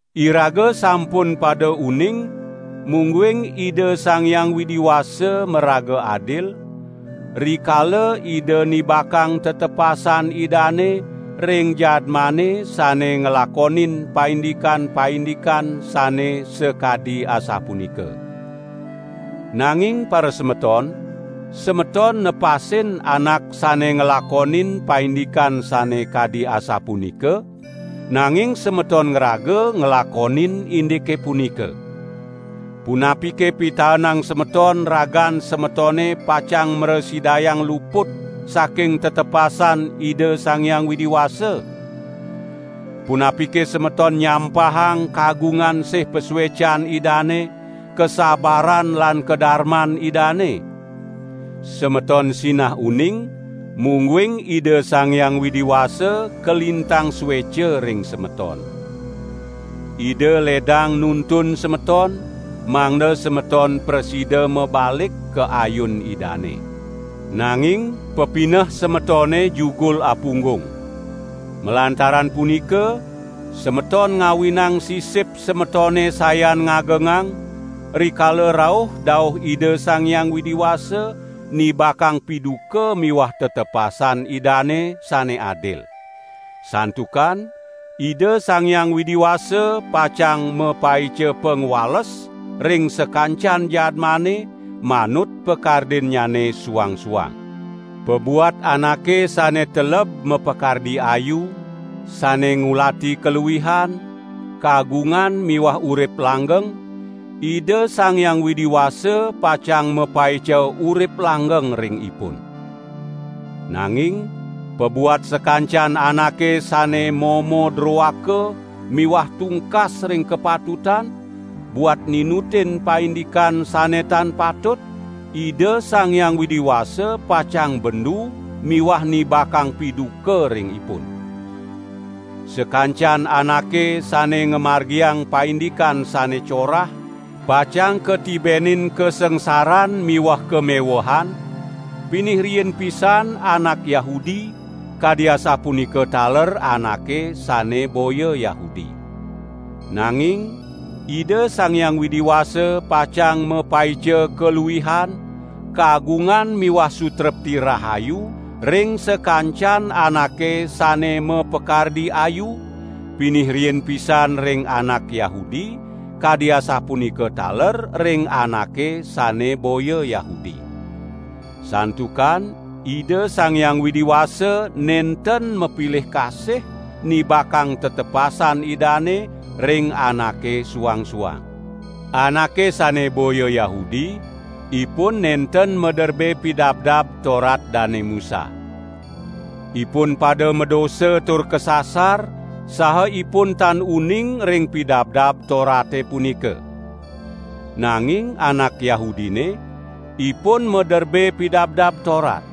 Iraga sampun pada uning mungguing Ida Sang Hyang Widi Wasa maraga adil, rikala Ida nibakang tetepasan Idane ring jadmane sane nglakonin paindikan-paindikan sane sakadi asapunika. Nanging parasemeton, semeton nepasin anak sane nglakonin paindikan sane kadi asapunika, nanging semeton ngraga nglakonin indike punika. Punapike pitaenang semeton ragan semetone pacang mrasidayang luput saking tetepasan Ida Sang Hyang Widi Wasa? Punapike semeton nyampahang kagungan sih pasuecan Idane, kasabaran lan kadarman Idane? Semeton sinah uning, mungguing Ida Sang Hyang Widi Wasa kalintang sueca ring semeton. Ida ledang nuntun semeton, mangda semeton prasida mabalik ka ayun Idane. Nanging pepineh semetone jugul apunggung. Malantaran punika, semeton ngawinang sisip semetone sayan ngagengang, rikala rauh dauh Ida Sang Hyang Widi Wasa nibakang piduka miwah tetepasan Idane sane adil. Santukan Ida Sang Hyang Widi Wasa pacang mapaica pangwales ring sakancan jadmane manut pakardinnyane suang-suang. Pabuat anake sane teleb mapakardi ayu, sane ngulati kaluihan, kagungan miwah urip langgeng, Ida Sang Hyang Widi Wasa pacang mapaica urip langgeng ring ipun. Nanging pabuat sakancan anake sane momo droaka miwah tungkas ring kapatutan, buat ninutin paindikan sane tan patut, Ida Sang Hyang Widi Wasa pacang bendu miwah nibakang piduka ring ipun. Sakancan anake sane ngamargiang paindikan sane corah, pacang katibenin kasangsaran miwah kamewehan, pinih riin pisan anak Yahudi, kadi asapunika taler anake sane boya Yahudi. Nanging Ida Sang Hyang Widi Wasa pacang mapaica kaluihan, kagungan miwah sutrepti rahayu ring sakancan anake sane mapakardi ayu, pinih riin pisan ring anak Yahudi, kadi asapunika taler ring anake sane boya Yahudi. Santukan Ida Sang Hyang Widi Wasa nenten mapilih kasih nibakang tetepasan Idane ring anake suang-suang. Anake sane boya Yahudi, ipun nenten maderbe Pidabdab Torat Dane Musa. Ipun pada madosa tur kasasar, saha ipun tan uning ring Pidabdab Torate punika. Nanging anak Yahudine, ipun maderbe Pidabdab Torat.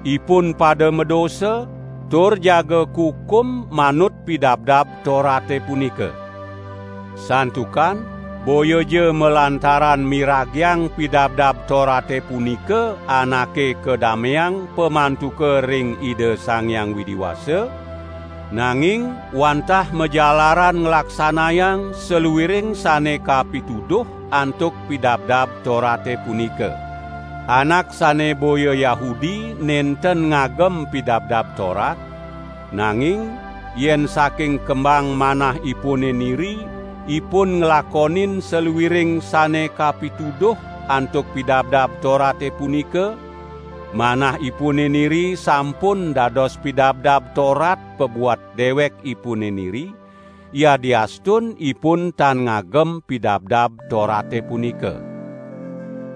Ipun pada madosa, tur jaga kukum manut Pidabdab Torate punika. Santukan boyaja malantaran miragiang Pidabdab Torate punika anake kadameang pamantuka ring Ida Sang Hyang Widi Wasa, nanging wantah majalaran nglaksanayang saluiring sane kapituduh antuk Pidabdab Torate punika. Anak sane boya Yahudi nenten ngagem Pidabdab Torat; nanging yen saking kembang manahipune niri ipun nglakonin saluiring sane kapituduh antuk Pidabdab Torate punika, manahipune niri sampun dados Pidabdab Torat pabuat dewekipune niri, yadiastun ipun tan ngagem Pidabdab Torate punika.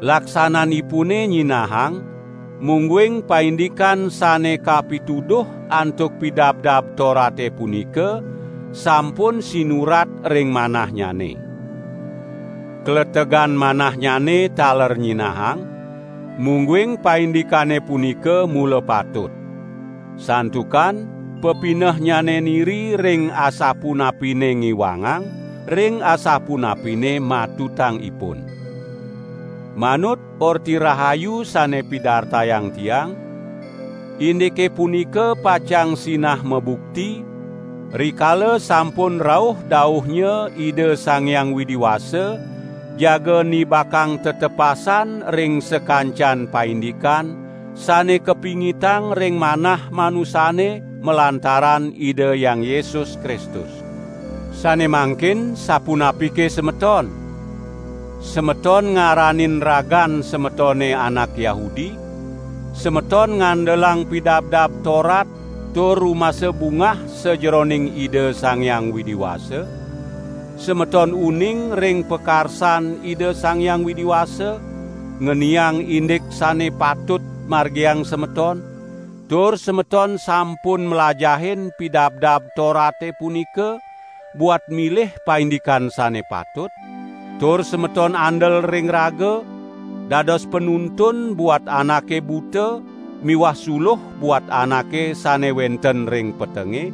Laksananipune nyinahang, mungguing paindikan sane kapituduh antuk Pidabdab Torate punika sampun sinurat ring manahnyane. Kletegan manahnyane taler nyinahang, mungguing paindikane punika mula patut. Santukan pepinehnyane niri ring asapunapine ngiwangang, ring asapunapine matutang ipun. Manut Orti Rahayu sane pidartayang tiang, indike punika pacang sinah mabukti, rikala sampun rauh dauhnya Ida Sang Hyang Widi Wasa jaga nibakang tetepasan ring sakancan paindikan sane kapingitang ring manah manusane malantaran Ida Hyang Yesus Kristus. Sane mangkin sapunapike semeton? Semeton ngaranin ragan semetone anak Yahudi, semeton ngandelang Pidabdab Torat tur rumasa bungah sajeroning Ida Sang Hyang Widi Wasa; semeton uning ring pakarsan Ida Sang Hyang Widi Wasa ngeniang indik sane patut margiang semeton, tur semeton sampun mlajahin Pidabdab Torate punika buat milih paindikan sane patut; tur semeton andel ring raga, dados panuntun buat anake buta miwah suluh buat anake sane wenten ring petenge,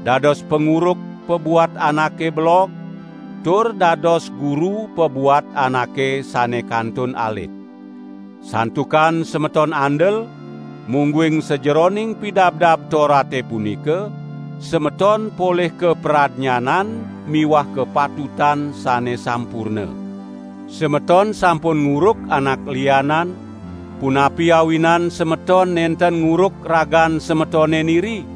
dados panguruk pabuat anake belog, tur dados guru pabuat anake sane kantun alit. Santukan semeton andel, mungguing sajeroning Pidabdab Torate punika, semeton polih kapradnyanan miwah kapatutan sane sampurna. Semeton sampun nguruk anak lianan, punapi awinan semeton nenten nguruk ragan semetone niri?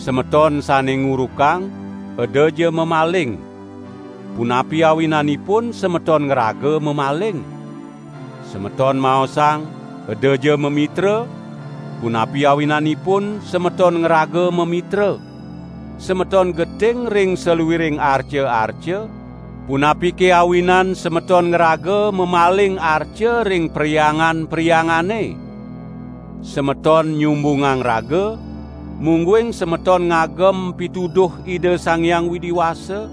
Semeton sane ngurukang: "Edaja mamaling!" Punapi awinanipun semeton ngraga mamaling? Semeton maosang: "Edaja mamitra!" Punapi awinanipun semeton ngraga mamitra! Semeton geting ring saluiring arca-arca, punapike awinan semeton ngraga mamaling arca ring perhyangan-perhyangane? Semeton nyumbungang raga, mungguing semeton ngagem pituduh Ida Sang Hyang Widi Wasa,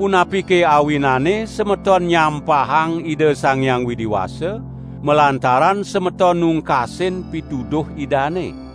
punapike awinane semeton nyampahang Ida Sang Hyang Widi Wasa, malantaran semeton nungkasin pituduh Idane?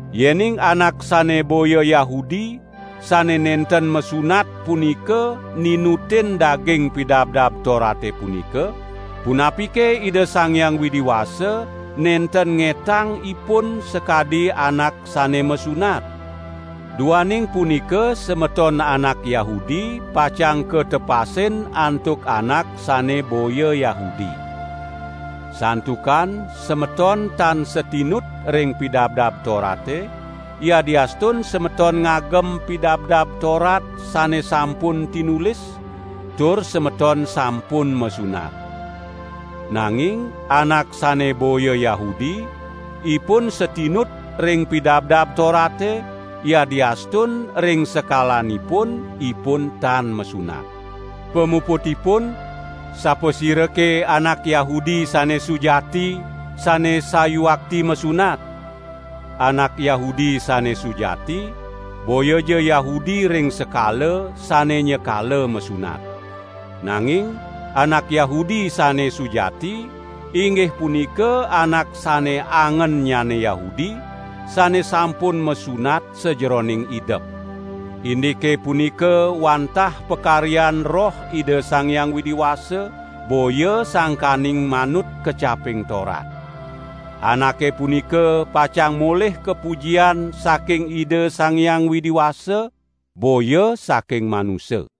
Yening anak sane boya Yahudi sane nenten masunat punika ninutin daging Pidabdab Torate punika, punapike Ida Sang Hyang Widi Wasa nenten ngetang ipun sakadi anak sane masunat? Duaning punika semeton anak Yahudi pacang katepasin antuk anak sane boya Yahudi. Santukan semeton tan satinut ring Pidabdab Torate, yadiastun semeton ngagem Pidabdab Torat sane sampun tinulis, tur semeton sampun masunat. Nanging anak sane boya Yahudi, ipun satinut ring Pidabdab Torate, yadiastun ring sekalanipun, ipun tan masunat. Pamuputipun, sapasirake anak Yahudi sane sujati, sane sayuakti masunat? Anak Yahudi sane sujati, boyaja Yahudi ring sekala sane nyakala masunat. Nanging anak Yahudi sane sujati, inggih punika anak sane angennyane Yahudi, sane sampun masunat sajeroning idep. Indike punika wantah pakaryan Roh Ida Sang Hyang Widi Wasa, boya sangkaning manut kecaping Torat. Anake punika pacang molih kapujian saking Ida Sang Hyang Widi Wasa, boya saking manusa.